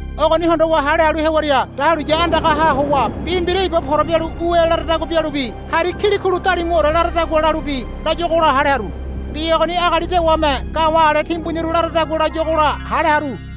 Ogoni hondowa hale halu hewaria dahuliya andagaha howa bi mbira iba pora bialu ue laradagua bialubi hari kilikulu dalimuore laradagua bialubi layuagola hale haru. Bi ogoni agali dewame ga̱wa̱ ale timbuniru laradagua layuagola hale haru.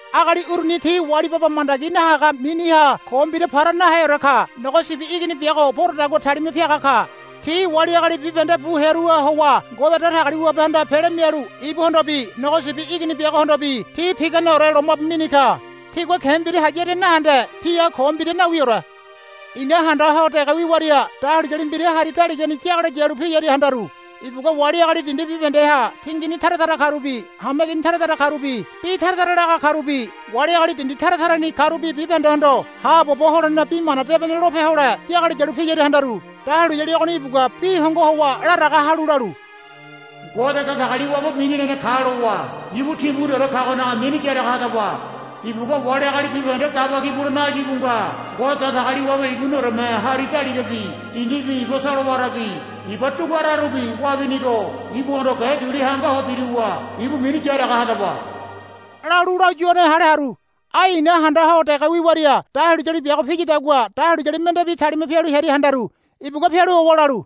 Agali uruni ti wali baba mandagi nahaga miniha ko mbira para naheore ka. Nogo Sibi Igini biago poradagua talima piaga ka. Ti wali agali bibahende bu hearuha howa Ngode Datagaliwabehanda pele mialu ibuhondobi Nogo Sibi Igini biagohondobi ti piganeore lomabu mini ka. Tigua ke̱ mbira hayaria nahende tiha ko mbira nawiore. I̱na handa ho dege wiwaria dahuliyali mbira hari daligani yagalo yalu piyaria handaru. Ibugua wali agali dindi bibahendeha tingini tara tara karubi hameigini tara tara karubi bi tara tara laga karubi wali agali dindi tara tarani karubi bibahendehondo haabobo holene Bi Mana Debene lope hole yagalo yalu piyaria handaru. Dahuliyali ogoni ibugua bi hongo howa laraga halu lalu, Ngode Datagaliwabe mini lene ka lowa ibu timbuniore kagonaga mini yaraga hadaba. Ibugua wali agali bibahende daba ki bulene áyu íbu nga. Ngode Datagaliwabe ibunioreme hari daligabi dindibi iba solowarabi iba duguararubi wabinigo ibuhondo ge duli hangaho biruwa ibu mini yaraga hadaba, lalu layuane hale haru. Ai i̱na handa ho dege wiwaria dahuliyali biago piyadagua dahuliyali mendebi talima pialu hearia handaru. Ibugua pialu howa lalu,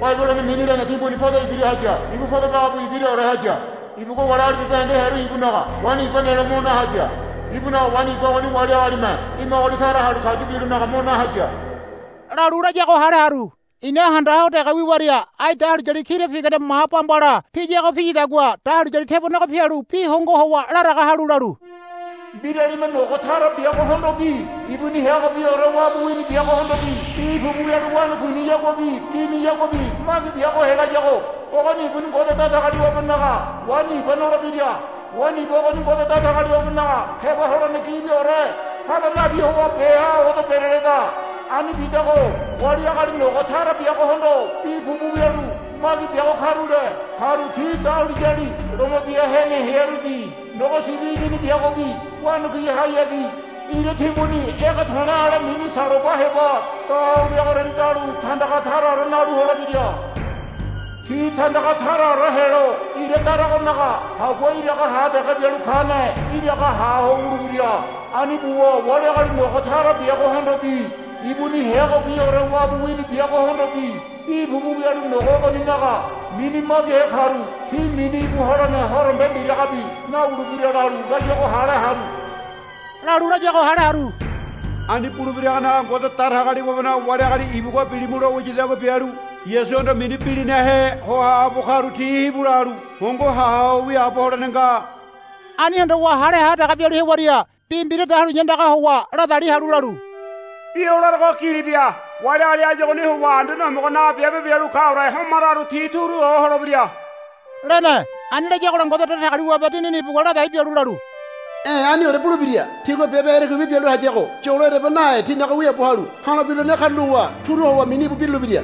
Babilono mini lene timbuni podo ibira haya. Ibu podo bagabu ibiraore haya. Ibugua wali agali bibahende hearu ibunaga waini iba nelo mo na haya. Ibunaga waini iba ogoni wali agalime dimagoli tara halu kayu bilonaga mo na haya, lalu layago hale haru. I̱na handa ho dege wiwaria ai dahuliyali kira pigane ma bambala piyago piyadagua dahuliyali tebonego pialu bi hongo howa laraga halu lalu, Mbiralime nogo tara biagohondobi ibuni heagobiore wabu wini biagohondobi bi pupu wialu wanakuiniyaguabi giniyaguabi magi biago helayago ogoni ibuni Ngode Datagaliwabenaga waini iba nolebira. Waini iba ogoni Ngode Datagaliwabenaga keba holene gibiore hada nabi howa beha odo bereleda. Ani bidago wali agali nogo tara biagohondo bi pupu wialu magi biago karule karu ti dahuliyali loma bia hene hearubi Nogo Sibi Igini biagobi wanakuihayagi ira timbuni ege to̱le̱ ale mini saloba heba da ho wiagoriani dalu tandaga taraore nalu holebira. Ti tandaga taraore helo ira daragonaga hagua iraga ha dege bialu kane iraga ha ho wulebira. Ani buwa wali agali nogo tara biagohondobi ibuni heagobiore wabu wini biagohondobi bi pupu wialu nogo ogoninaga mini magihe karu ti mini íbu holene horombe mbiragabi nawulebira, lalu layago hale haru. Ani bulebiragonaga Ngode Datagaliwabenaga wali agali ibugua, Bilimu, lo wiyadagua bialu Yasuhondo mini bilinahe ho haabo karu ti hibu lalu hongo ha ho wiaabo holene nga. Ani hondowa hale ha dege bialu hewaria bi mbira dahuliya andagaha howa ladali halu lalu, Bi o larogo gili bia. Wali agali áyu ogoni howa Anduane Homogonaga biabe bialu kaore homararu ti turu ho holebira, lene. Ani layagola Ngode Datagaliwabe Dinini ibugua ladai bialu lalu, E̱ aniore bulebira. Tigua biabe erekuibi bialu hayago yolo ereba nahe tinaga wiaabo halu ha̱lo birulene karulowa turu howa mini íbu birulebira,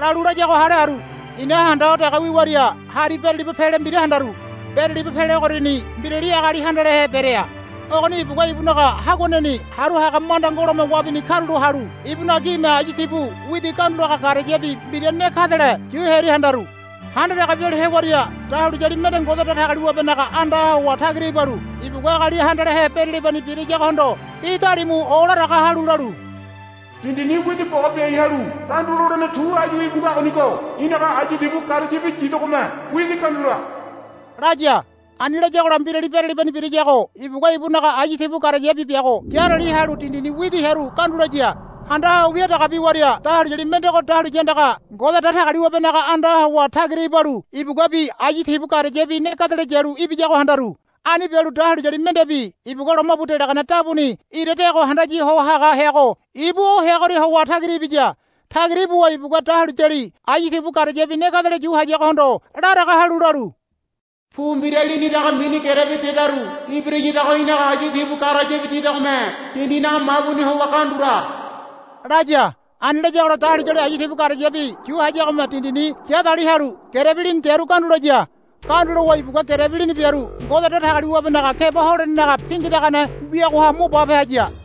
lalu layago hale haru. I̱na handa ho dege wiwaria hari beraliba pele mbira handaru. Beraliba pele ogoriani mbirali agali handalehe berea. Ogoni ibugua ibunaga haguaneni haru haga manda ngolome wabini karulo halu ibunaga gime ayu tibu widi gandulaga garayabi mbira ne gadele yu hearia handaru. Handa dege bialu hewaria dahuliyali mende Ngode Datagaliwabenaga andaha howa tagira ibalu ibugua agali handalehe beralibani birayagohondo bi dalimu olaraga halu lalu, Dindini widi boga biai halu gandu lolene tu áyu íbu ngagonigo í̠naga ayu tibu garayabi yidegome widi gandula, laya. Ani layagola mbirali beralibani birayago ibugua ibunaga ayu tibu garayabi biago yarali halu dindini widi hearu gandu laya. Handa ho wia dege biwaria dahuliyali mendego dahuliya andaga Ngode Datagaliwabenaga andaha howa tagira ibalu ibuguabi ayu tibu garayabi ne gadele yalu ibiyago handaru. Ani bialu dahuliyali mendebi ibugua lomabu delagane dabuni ira deago handaya ho haga heago ibu o heagoria howa tagira ibiya. Tagira ibuwa ibugua dahuliyali ayu tibu garayabi ne gadele yu hayagohondo laraga halu lalu, Pu mbira lini daga mini gerebi dedaru ibirayadago í̠naga ayu tibu garayabi yidegome dindinaga mabuni howa gandula, laya. Ani layagola dahuliyali ayu tibu garayabi yu hayagome dindini ya dali halu gerebi mini dearu gandu laya. Gandu lowa ibugua gerebi lini biaru Ngode Datagaliwabenaga keba holenenaga pingidagane wiagoha mo bape haya.